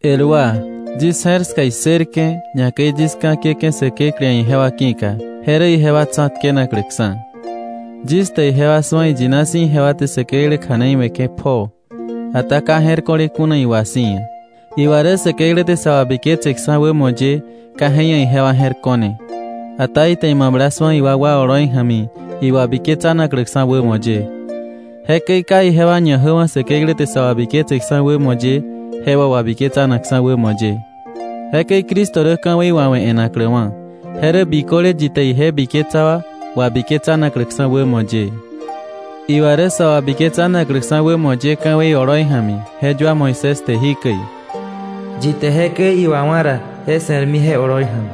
El wa, yis je̱r ska issërke̱, ñakäi yis ka̱ kiäke̱ Säkeklä ia̱ ijewa ki̱ka, je rä ijewa tsa̱tkenakläksa̱. Yis te ijewa su̱a iyina si̱ ijewa te Säkeklä kja̱nei we̱ke̱ pjoo, ata ka je̱r ko̱le kuna iwa si̱ ia̱. Iwa rä Säkeklä te sa wabiketseksa̱ wämo ye ka je ia̱ ijewa je̱r ko̱ne, ata ite imabla su̱a iwakwa oloi ja̱mi iwabiketsanakläksa̱ wämo ye. Jekäi ka ijewa ñajäwa̱ Säkeklä te sa wabiketseksa̱ wämo ye, je wà wabiketsanakksa̱ wämo ye. Jekäi Cristo rä ka̱wei wawe̱ e̱nakläwa̱, je rä biköle yi te ije biketsa wa wabiketsanakläksa̱ wämo ye. Iwa rä sa wabiketsanakläksa̱ wämo ye ka̱wei oloi ja̱mi, je yua Moisés te jikäi: “Yi te jekäi iwawa̱ ra, je se̱rmi je oloi ja̱mi.”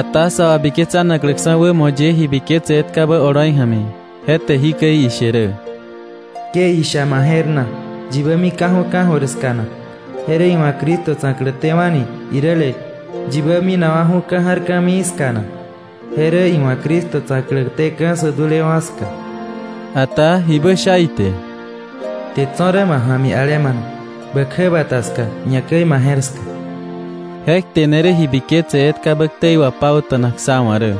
Ata sa wabiketsanakläksa̱ wämo ye ji biketse etkabä oloi ja̱mi, je te jikäi ishe rä: “Ke isha ma je̱r na: ‘¿Yibä mika̱ju̱ ka̱jöir ska na?’ —je rä iwa̱ Cristo tsa̱klätéwa̱ni— iräle: ‘¿Yibä minawa̱ju̱ ka̱ ja̱r ka̱mii ska na?’” —je rä iwa̱ Cristo tsa̱klätéka̱ sä dulewa̱ wa ska. Ata ¿jibä sha ite?: “Kte tso̱ rä ma ja̱mi alemana, bä kjäbata ska, ñakäi ma je̱r ska.” Je kte ne rä ji biketse etkabä ktei wapauta̱nak sá wa̱ rä.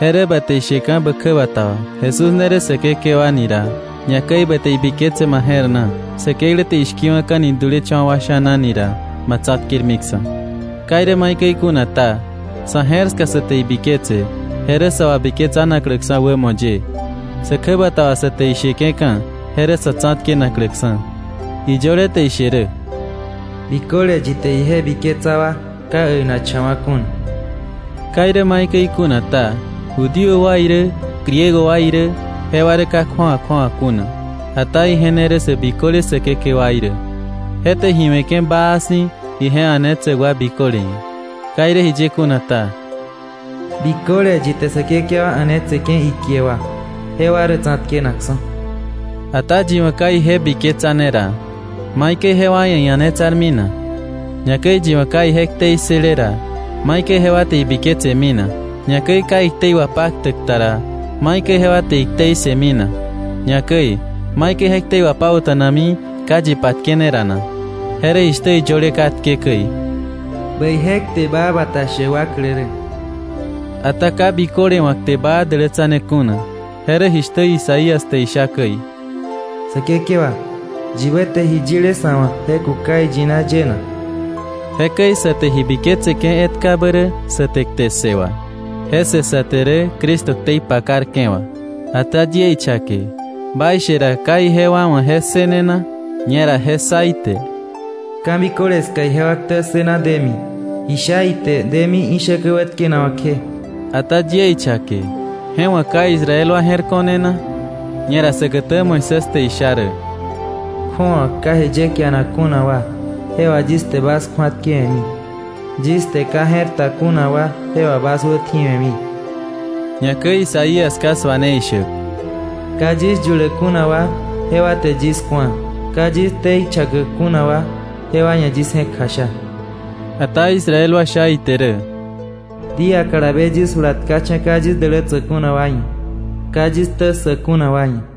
Je rä ba te isheka̱ bä kjäbata wà Jesús ne rä Säkekewa ni ra, ñakäi ba te ibiketse ma je̱r na Säkeklä te ishki̱wa̱ka̱ni dulecha̱wa̱ wa sha̱na ni ra, ma tsa̱tkermiksa̱. Ka irä maikäi kuna ta, sa̱ je̱r ska sa te ibiketse, je rä sa wabiketsanakläksa̱ wämo ye. Sä kjäbata wà sa te isheke̱ka̱, je rä sa̱ tsa̱tkenakläksa̱. Iyöle te ishe rä: “Biköle yi te ije biketsa wa ka äinakcha̱wa̱ kuna.” Ka irä maikäi kuna ta, Judío wa irä, Griego wa irä, jewa rä ka kju̱awa kju̱awa kuna. Ata ije ne rä sä biköle Säkekewaí rä. Je te ji we̱ke̱ baa si̱ ije a̱netsäk wa biköle ia̱. Ka irä jiye kuna ta: “Biköle yi te Säkekewa a̱netseke̱ ikie wà, jewa rä tsa̱tkenakksa̱.” Ata yi wa̱ ka ije biketsane ra, ¿maikäi jewa ia̱ ia̱netsarmi na? Ñakäi yi wa̱ ka ije ktei ssële ra, ¿maikäi jewa te ibiketsemi na? Ñakäi ka iktei wapaktäk ta ra, ¿maikäi jewa te iktei ssëmi na? Ñakäi ¿maikäi je ktei wapauta̱nami ka yi patkene ra na? Je rä jishtä iyöle katke käi: “Bäije kte baa bata shäk wa klä rä.” Ata ka biköle wa̱ kte baa dälätsane kuna. Je rä jishtä Isaías te isha käi: “Säkekewa ¿yibä te ji yile sa̱ wa̱ je kuka iyina ye na?” Jekäi sa te ji biketseke̱ etkabä rä sa te kte ssë wà. Je ssë sa te rä Cristo ktei pakarke̱ wà. Ata yie ichake, ¿baishe ra, ka ijewa wa̱ je ssëne na? Ñera je ssa ite. “Ka̱biköle ska ijewa ktä ssëna demi, ji sha ite demi ishäkä wätkenawa̱ kje.” Ata yie ichake: ¿Je wa̱ ka Israel wa je̱r ko̱ne na? Ñera säkätä Moisés te isha rä: “Kju̱awa ka ji ye kianak kuna wa, je wà yis te bas kju̱atkewe̱mi. Yis te ka je̱r ta kuna wa, je wà bas wätji̱we̱mi.” Ñakäi Isaías ka suane ishäk: “Ka yis yuläk kuna wa, jewa te yis ku̱a; Ka yis ktei chakäk kuna wa, jewa ia̱ yis je̱k kjasha.” Ata Israel wa sha ite rä: “Día kalabe yis jula tkacha̱ ka yis dälätsäk kuna wa ia̱, ka yis ktä ssäk kuna wa ia̱.”